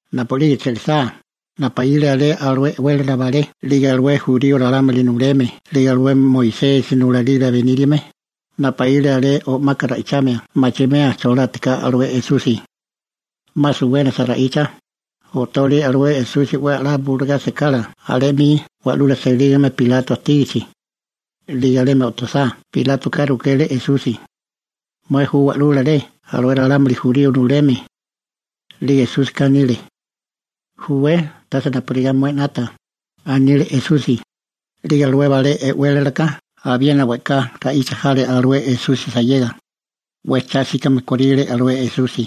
Napu'lige che'lisá, napaíle alé alué e'wélala balé 'lige alué jurío ralámuli nuleme 'lige alué Moisesi nulalila beníriame, napaíle alé o'maka ra'ichamia machimea cholátiká alué Esusi. 'Ma suwénasa ra'icha, o'tole alué Esusi 'we a'lá bulugá sekala alé 'mi wa'lula selígame Pilato ajtígichi. 'Lige alemi o'tosá Pilátoka rukele Esusi: ―¿Mué ju Wa'lula rey alué ralámuli jurío nuleme? 'Lige Esúsika anile: ―Júwé, tase napurigá mué 'nata ―anile Esusi. 'Lige alué balé e'wélalaka abiena we'ká ra'icha jale alué Esusi sayega, 'we cha 'síkame kóríle Esusi.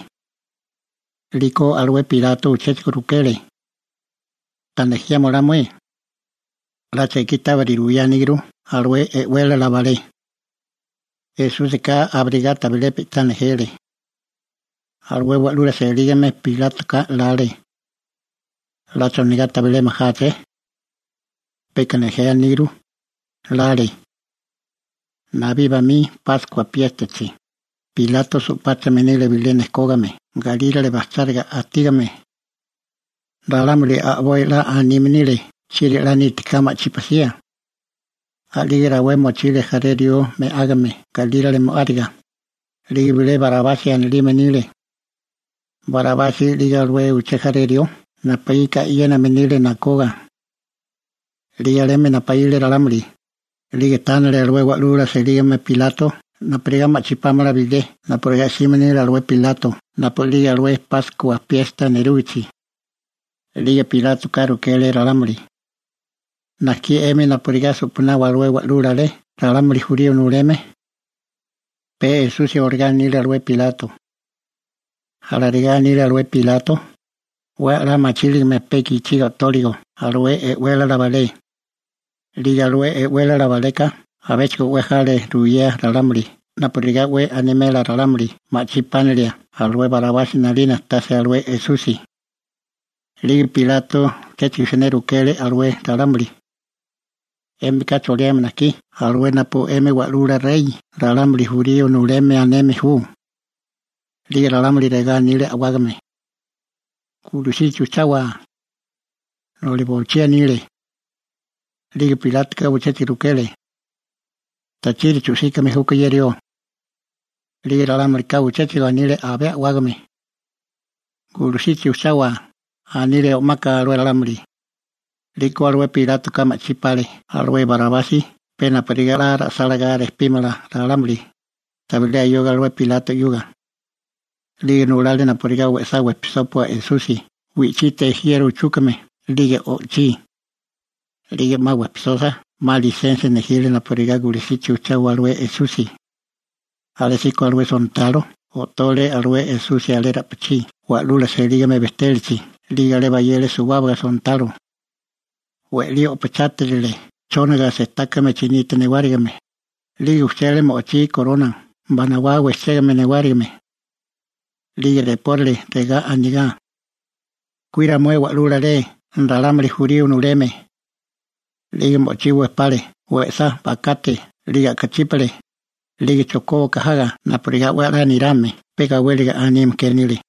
'Liko alué Pilato uchéchigo rukele: ―¿Ta nejiama olá mué? 'La chekí tábiri ruyáníguru alué e'wélala balé. Esúsika abirigá tabilé pe'tá nejele. Alué wa'lula selígame Pilátoka lale: «¿'La chonigá tabilé majáché? Peka nejé aníguru», 'lale. Nabí bamí Páskua piéstachi, Pilato su'páchame nile bilé nejkógame galírale bajcháriga ajtígame. Ralámuli a'boi 'la anime nile chieri 'la nítiká ma'chí pasía. A'lige rawé mochile jaré rió me'ágame galírale mo'áriga, 'lige bilé Barabasi anilime nile. Barabasi 'lige alué uché jaré rió napuíka e'yéname nile nakoga. 'Lige alemi napaíle ralámuli, 'lige tánale alué wa'lula selígame Pilato napurigá ma'chí pámala bilé napurigá 'sime nile alué Pilato napu'lige alué Páskua piesta nerúgichi. 'Lige Pilátoka rukele ralámuli: ―¿Najkí 'emi napurigá su'panawa alué Wa'lula Rey ralámuli jurío nuleme? (Pe Esusi olagá anile alué Pilato.) Alarigá anile alué Pilato, 'we a'lá machíligame pe gichiga o'tóligo alué e'wélala balé. 'Lige alué e'wélala baleka abéchigo 'we jale ruyea ralámuli napurigá 'we animela ralámuli ma'chí pánalia alué Barabasi 'nalina tase alué Esusi. 'Lige Pilato uchéchigo siné rukele alué ralámuli: ―¿'Émika choliame najkí alué napu 'emi Wa'lula Rey ralámuli jurío nuleme aneme ju? 'Lige ralámuli regá anile a'wágame: ―¡Gulusichi ujchawa! ―noli bochí anile. 'Lige Pilátoka uchéchigo rukele: ―¿Tachiri chu'síkame júkó ye rió? 'Lige ralámulika uchéchigo anile abé a'wágame: ―¡Gulusichi ujchawa! ―anile o'maka alué ralámuli. 'Liko alué Pilátoka ma'chí pale alué Barabasi pe napurigá 'la ra'sálagá ejtebímala ralámuli, tabilé ayoga alué Pilato 'yuga. 'Lige nulale napurigá we'sá wejpisópua alué Esusi wi'chite jiero uchúkame 'lige o'chí. 'Lige 'ma wejpisosa, 'ma lisensia nejile napurigá gulusichi ujchawa alué Esusi. Alésíko alué sontalo o'tole alué Esusi alé ra'pichí wa'lula selígame bejtélachi, 'lige alé bayele suwábaga sontalo. We'lí o'pachátirile chónaga sejtákame chinite newárigime, 'lige ujchele mo'chí gorona banawá wejchégame newárigime. 'Lige repórale regá anigá: ―¡Kuira mué Wa'lula Rey ralámuli jurío nuleme! 'Lige mo'chí wejpale we'sá bakate 'lige a'kachípale, 'lige chojkóbaka jaga napurigá 'we 'la nirame, pe gawéliga anime ke anile.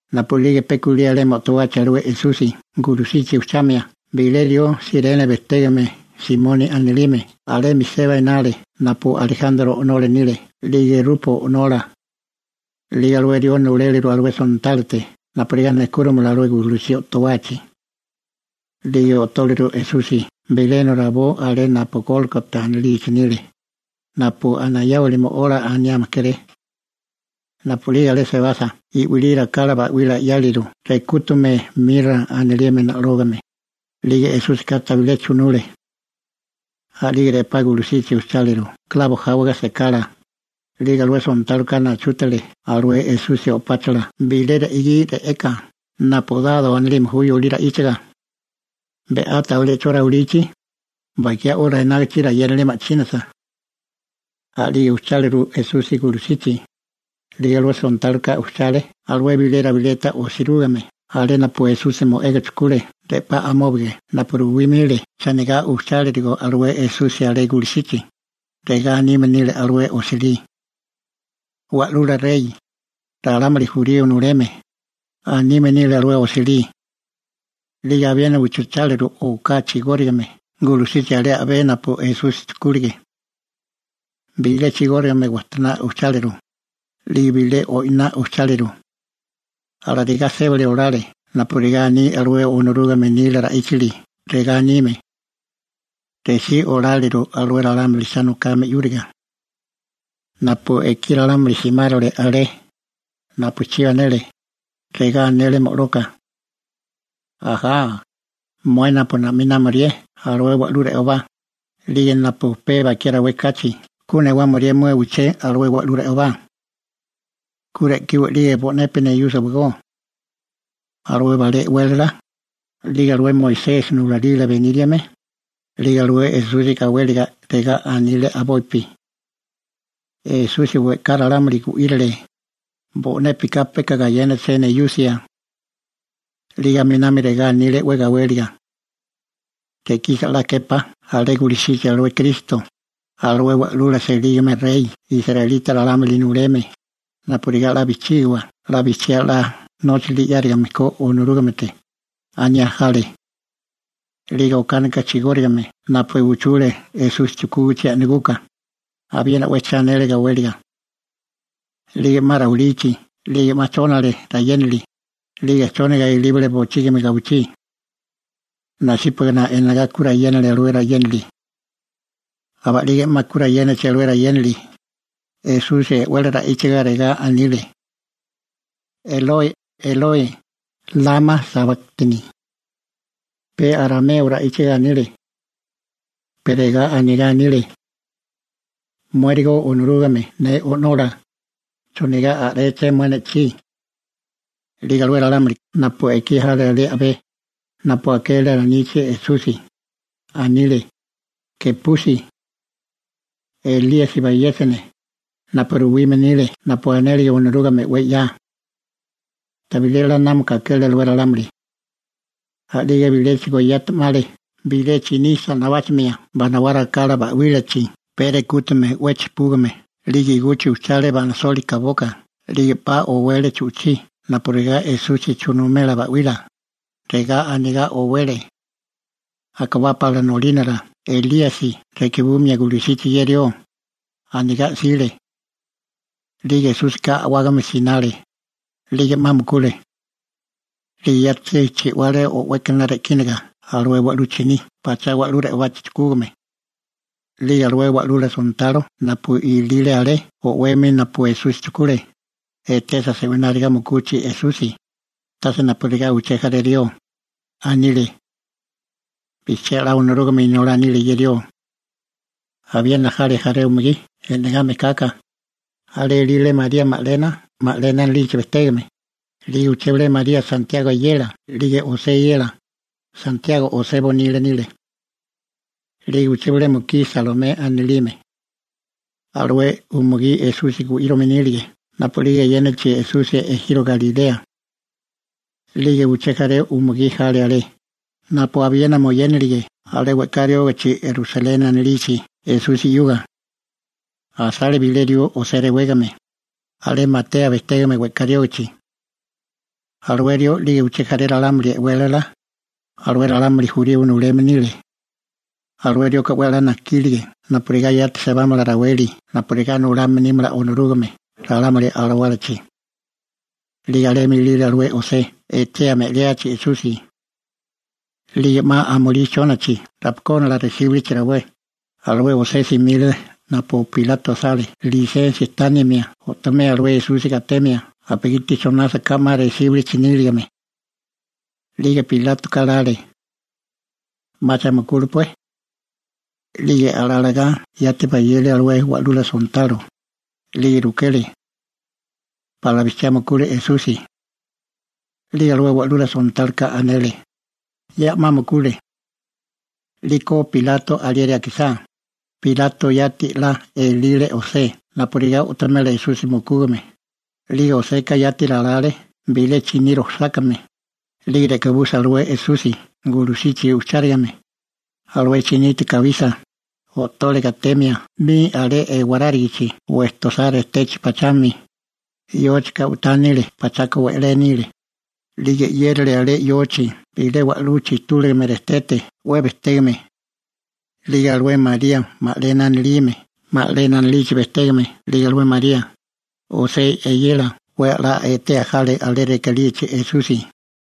Napu'lige pe kulí alemi o'towachi alué Esusi gulusichi ujchamia, bilé rió Sirene bejtégame Simoni anilime alemi seba enale napu Alejantro o'nola nile 'lige Rupo o'nola. 'Lige alué rió nuléleru alué sontálote napurigá nejkúrimala alué gulusí o'towachi. 'Lige o'tóleru Esusi bilena rabó alé napu Gólgota anilichi nile, napu «Anayáwali Mo'ola», aniame kéré. Napu'lige alé sebasa i'wilí rakala ba'wila 'yáleru rekútume «mira» anilime na'lógame, 'lige Esúsika tabilé chunule. A'lige re'pá gulusichi ujcháleru klabo jáwaga sekala, 'lige alué sontáloka nachútale alué Esusi o'páchala bilé re'gí re'eka (napu «dado» anilime ju yolí ra'íchaga). Be'á tabilé 'cho rawilichi, (Bakiá 'ora enágichi rayénali ma'chínasa.) a'lige ujcháliru Esusi gulusichi. 'Lige alué sontáloka ujchale alué bilé rabileta osirúgime alé napu Esusi mo'ega chujkule re'pá amóbige napu ruwime nile chonigá ujchálirigo alué Esusi alé gulusichi, regá anime nile alué osilí: «Wa'lula rey, ralámuli jurío nuleme», anime nile alué osilí. 'Lige abiena ujchucháleru oká chigórigame gulusichi alé a'bé napu Esusi chujkúlige. Bilé chigórigame wajtoná ujcháleru, 'lige bilé o'iná ujcháleru. Alarigá sébali olale napurigá aní alué Onorúgame nila ra'íchili regá anime: «Resí oláliru alué ralámuli cha nokame 'yúriga.» Napu ekí ralámuli simárole alé, napu chibi anele, regá anele mo'loka: ―¡Ajá, mué napu na'minámorié alué wa'lú re'obá, 'lige napu pe bakiá rawé kachi ku newámorié mué uché alué wa'lú re'obá! ¡Ku re'kiwa 'lige bo'nepi neyúsiwagó! Alué balé e'wélala, 'lige alué Moisesi nulalila beníriame, 'lige alué Esusi gawéliga regá anile a'bopi: ―Esusi we'ká ralámuli gu'írile, bo'népika peka gayénaché neyusia. 'Lige aminami regá anile 'we gawéliga: ―Re'kisa 'la képá alé gulusichi alué Kristo, alué wa'lula selígame rey israelita ralámuli nuleme, napurigá 'la bijchígiwa 'la bijchiá 'la nóchali 'yárigame ko Onorúgamete ―aniá jale. 'Lige okánika chigórigame napu uchule Esusi chujkúgichi a'naguka, abiena 'we cha anele gawéliga. 'Lige 'ma rawilichi 'lige 'ma chónale rayénali, 'lige chónaga ilíbale bochígimi alé gawichí. Nasípagana enagá ku rayénale alué rayénali. Aba'lige 'ma ku rayénachi alué rayénali, Esusi e'wele ra'íchaga regá anile: ―Eloi, Eloi ¿lama sabáktani? (Pe arameo ra'íchaga anile.) Pe regá anigá anile: «Muérigo Onorúgame ne O'nola, ¿chonigá a'réché mué ne'chí?» 'Lige alué ralámuli napu ekí jale alé a'bé, napu akele alanichi Esusi, anile: ―¡Gepusi! ¡Elíasi bayéchane, napu ruwime nile napu anélige Onorúgame 'we 'ya! Tabilé 'la námaka akele alué ralámuli. A'lige biléchigo yati 'male bilé chiní sa'nabáchamia banawá rakala ba'wílachi pee rekútume 'we chijpúgame 'lige iguchi ujchale ba'nasoli kaboka, 'lige 'pa owele chu'chí napurigá Esusi chunumela ba'wila, regá anigá owele: ―Akabá pala nolínara Elíasi re'kibumia gulusichi ye rió ―anigá 'sile. 'Lige Esúsika a'wágame sinale, 'lige 'ma mukule. 'Lige yati chi'wale o'wékana re'kínaga alué wa'lú chiní pachá wa'lú re'obachi chujkúgame. 'Lige alué wa'lula sontalo napu ilile alé o'wemi napu Esusi chujkule, etesa se'wináriga mukuchi Esusi, tase napurigá uché jaré rió, anile: ―Bijchiá 'la Onorúgame Inolá nile ye rió. Abiena jale jaré umugí e'negá mejkaka, alé ilile María Magalena, Magalena anilichi bejtégame, 'lige uché bilé María Santiago eyela 'lige José eyela (Santiago José bonila nile), 'lige uché bile mukí Salomé anilime. Alué umugí Esusi gu'írome nílige napu'lige eyénachi Esusi ejiro Galilea. 'Lige uché jaré umugí jale alé, napu abiena moyénalige alé we'ká riógichi Rusaleni anilichi Esusi 'yuga. Asale bilé rió José rewégame, Arimatea bejtégame we'ká riógachi. Alué rió 'lige uché jaré ralámuli e'wélala, alué ralámuli jurío nuleme nile. Alué rioka 'we a'lá najkílige napurigá yati sebámala raweli napurigá nulame nímala Onorúgame ralámuli alawálachi. 'Lige alemi ilile alué José etea me'liachi Esusi. 'Lige 'ma amulí chónachi rapakónala resíbilichi rawé, alué José simile napu Pilato asale lisensia tánimia o'tomea alué Esusi gatemia, napugiti chonásaká 'ma resíbilichi níligame. 'Lige Pilátoka lale: «'Macha mukúlepué.» 'Lige yati bayele alué wa'lula sontalo, 'lige rukele: ―¿Pala bijchiá mukule Esusi? 'Lige alué wa'lula sontáloka anele: ―Ya 'ma mukule. 'Liko Pilato alieri akisá, Pilato yati 'la elile José napurigá o'tomela Esusi mukúgame, 'lige Joseka yati ralale bilé chiní rojsákame, 'lige re'kabusa alué Esusi gulusichi ujchárigame, alué chinite kabisa, o'tole gatemia 'mi alé ewarárigichi wejtosá rejtechi pachami, yóchika u'tá nile 'lige pachaka we'lé nile, 'lige 'yérale alé yochi bilé wa'lú chijtúligame rejtete 'we bejtégame. 'Lige alué María Magalena anilime, 'lige alué María, José ('lige Santiago) eyela, 'we a'lá etea jale alé rekalíachi Esusi.